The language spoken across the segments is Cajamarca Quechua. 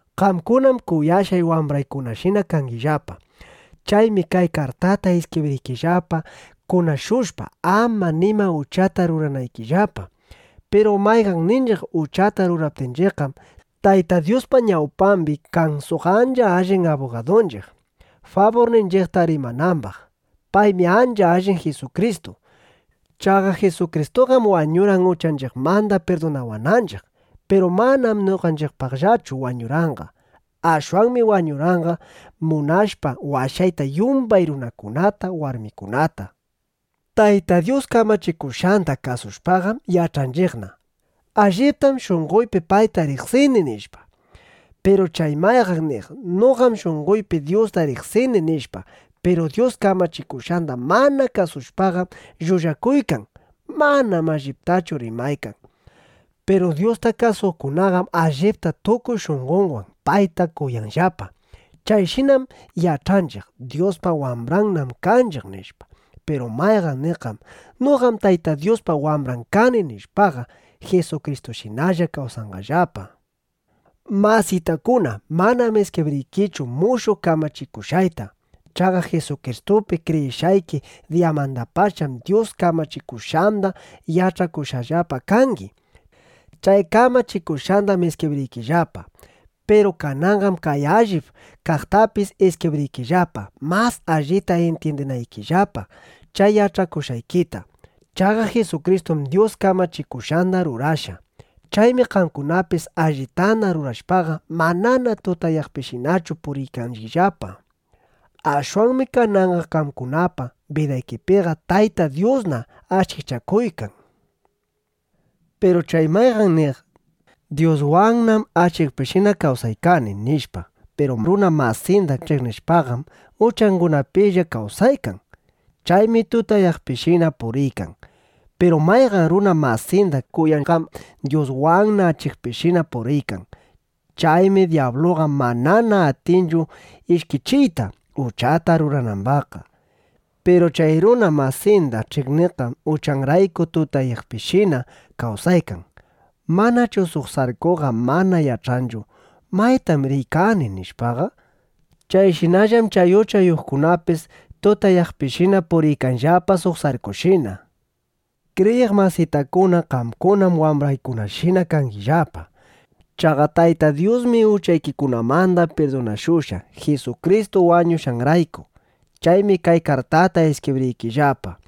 Qamkunam kuyashqay wambraykunashina kangillapa. Chaymi kay kartata iskibriykillapa kunashushpa, ama nima uchata ruranaykillapa. Piru mayqanninchiq uchata ruraptinchiqqam, Tayta Dyuspa ñawpambi kan suq ancha allin abugadunchiq, faburninchiqta rimanambaq. Paymi ancha allin Jisukristu. Chaqa Jisukristuqam wañurqan uchanchiqmanda pirdunawananchiq. Piru manam noqanchiqpaqllachu wañurqanqa. Ashwanmi wañurqanqa munashpa washayta yumbay runakunata, warmikunata. Tayta Dyus kamachikushqanda kasushpaqam yach'anchiqna: Alliptam shunqoypi payta riqsini, nishpa. Piru chay mayqan niq: “Noqam shunqoypi Dyusta riqsini”, nishpa, piru Dyus kamachikushqanda mana kasushpaqam llullakuykan. Manam alliptachu rimaykan. Piru Dyusta kasuqkunaqam allipta tukuy shunqonwan payta kuyanllapa. Chayshinam yach'anchiq: Dyuspa wambrannam kanchiq, nishpa. Piru mayqan niqqam: “Noqam Tayta Dyuspa wambran kani” nishpaqa, Jisukristushinalla kawsanqallapa. Masitakuna, manam iskibriykichu mushuq kamachikushqayta. Chaqa Jisukristupi kriyishqayki diyamandapacham Dyus kamachikushqanda yach'akushqallapa kangi. Chay kamachikushqandam iskibriykillapa. Piru kananqam kay allip kaqtapis iskibriykillapa, mas allita intyindinaykillapa chay yach'akushqaykita. Chaqa Jisukristum Dyus kamachikushqanda rurashqa. Chaymi qamkunapis allitana rurashpaqa, manana tutayaqpishinachu puriykangillapa. Ashwanmi kananqa qamkunapa bidaykipiqa Tayta Dyusna achikchakuykan. Piru chay mayqan niq: “Dyuswannam achikpishina kawsaykani” nishpa, piru runa masinda ch'iqnishpaqam, uchangunapilla kawsaykan. Chaymi tutayaqpishina puriykan. Piru mayqan runa masinda kuyaqqam Dyuswanna achikpishina puriykan. Chaymi dyabluqa manana atinchu ishkichiyta, uchata ruranambaqqa. Piru chay runa masinda ch'iqniqqam uchanrayku tutayaqpishina kawsaykan. Manchu suq sarkuqa mana yach'anchu: Maytam riykani, nishpaqa. Chayshinallam chay uchayuqkunapis tutayaqpishina puriykanllapa suq sarkushina. Kriyiq masitakuna, qamkunam wambraykunashina kangillapa. Chaqa Tayta Dyusmi uchaykikunamanda pirdunashushqa, Jisukristu wañushqanrayku. Chaymi kay kartata iskibriykillapa.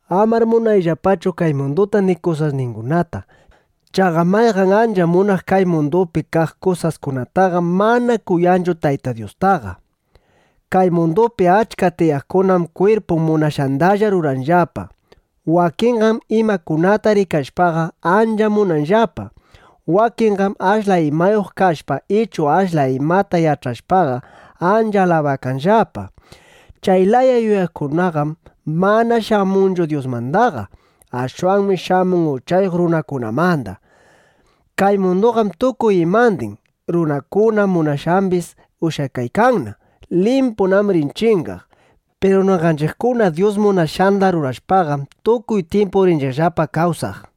Amar munayllapachu kay munduta ni kusasningunata. Chaqa mayqan ancha munaq kay mundupi kaq kusaskunataqam mana kuyanchu Tayta Dyustaqa. Kay mundupi achka tiyaqkunam kwirpun munashqandalla ruranllapa. Wakinqam imakunata rikashpaqa, ancha munanllapa. Wakinqam ashla imayuq kashpa ichu ashla imata yach'ashpaqa, ancha alabakanllapa. Chay laya yuyaykunaqam mana shamunchu Dyusmandaqa. Ashwanmi shamun uchayuq runakunamanda. Kay munduqam tukuy imandin, runakuna munashqambis ushyakaykanna. Limpunam rin chingaq. Piru noqanchiqkuna Dyus munashqanda rurashpaqam, tukuy tyimpu rinchiqllapa kawsaq.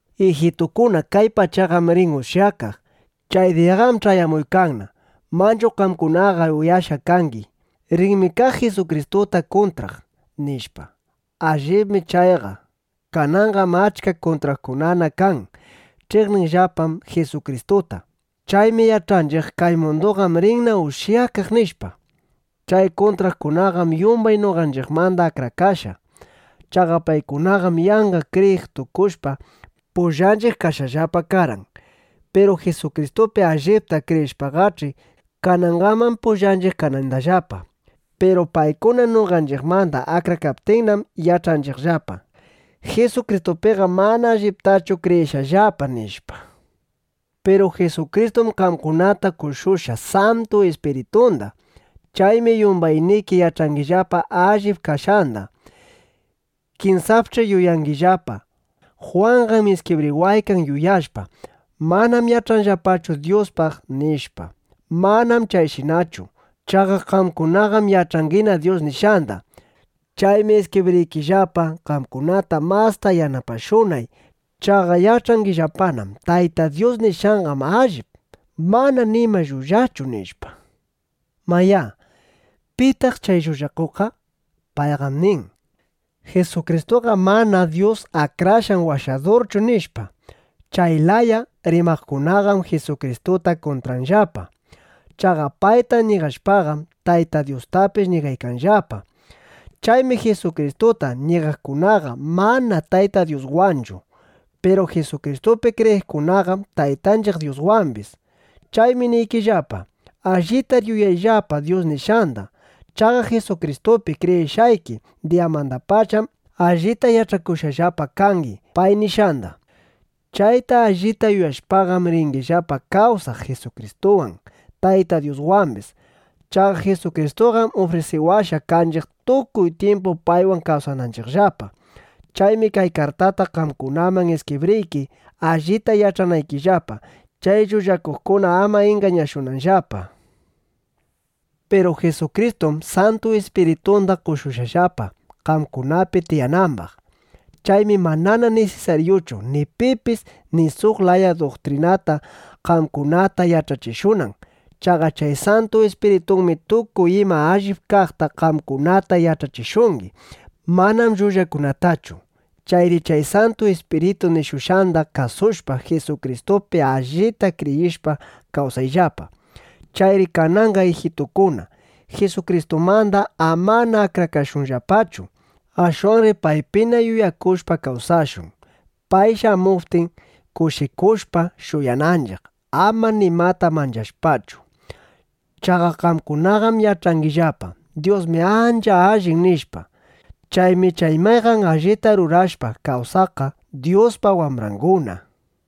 Ijitukuna, kay pachaqam rin ushyakaq. Chay diyaqam ch'ayamuykanna. Manchu qamkunaqa uyashqa kangi: “Rinmi kaq Jisukristuta kuntraq”, nishpa. Allibmi chayqa. Kananqam achka kuntraqkunana kan. Ch'iqninllapam Jisukristuta. Chaymi yach'anchiq: Kay munduqam rinna ushyakaq, nishpa. Chay kuntraqkunaqam yumbay noqanchiqmanda akrakashqa. Chaqa paykunaqam yanqa kriyiq tukushpa, pullanchiq kashqallapa karqan. Piru Jisukristupi allipta kriyishpaqach'i, kanangaman pullanchiq kanandallapa. Piru paykuna noqanchiqmanda akrakaptinnam, yach'anchiqllapa: Jisukristupiqam mana alliptachu kriyishqallapa, nishpa. Piru Jisukristum qamkunata qoshushqa Santu Ispiritunda. Chaymi yumbayniki yach'angillapa allip kashqanda. Kinsapch'i yuyangillapa: Jwanqam iskibriwaykan yuyashpa: Manam yach'anllapachu Dyuspaq, nishpa. Manam chayshinachu. Chaqa qamkunaqam yach'angina Dyus nishqanda. Chaymi iskibriykillapa, qamkunata masta yanapashunay. Chaqa yach'angillapanam: Tayta Dyus nishqanqam allip. Manam nima llullachu, nishpa. Mayá, ¿pitaq chay llullakuqqa? Payqam nin: “Jisukristuqam mana Dyus Akrashqan Washadurchu”, nishpa. Chay laya rimaqkunaqam Jisukristuta kuntranllapa. Chaqa payta ñigashpaqam, Tayta Dyustapis ñigaykanllapa. Chaymi Jisukristuta ñigaqkunaqa mana Tayta Dyuswanchu. Piru Jisukristupi kriyiqkunaqam Taytanchiq Dyuswambis. Chaymi niykillapa: Allitar yuyayllapa Dyus nishqanda. Chaqa Jisukristupi kriyishqayki diyamandapacham allita yach'akushqallapa kangi pay nishqanda. Chayta allita yuyashpaqam, ringillapa kawsaq Jisukristuwan, Tayta Dyuswambis. Chaqa Jisukristuqam ufrisiwashqa kanchiq, tukuy tyimpu paywan kawsananchiqllapa. Chaymi kay kartata qamkunaman iskibriyki, allita yach'anaykillapa, chay llullakuqkuna ama ingañashunanllapa. Piru Jisukristum Santu Ispiritunda qoshushqallapa, qamkunapi tiyanambaq. Chaymi manana nisisaryuchu, ni pipis suq laya duktrinata qamkunata yach'achishunan. Chaqa chay Santu Ispiritunmi tukuy ima allip kaqta qamkunata yach'achishungi; manam llullakunatachu. Chayri chay Santu Ispiritu nishushqanda kasushpa, Jisukristupi allita kriyishpa kawsayllapa. Chayri kananqa ijitukuna, Jisukristumanda amana akrakashunllapachu. Ashwanri paypina yuyakushpa kawsashun, pay shamuptin, kushikushpa shuyananchiq, ama nimata manchashpachu. Chaqa qamkunaqam yach'angillapa: Dyusmi ancha allin, nishpa. Chaymi chay mayqan allita rurashpa kawsaqqa Dyuspa wambranguna.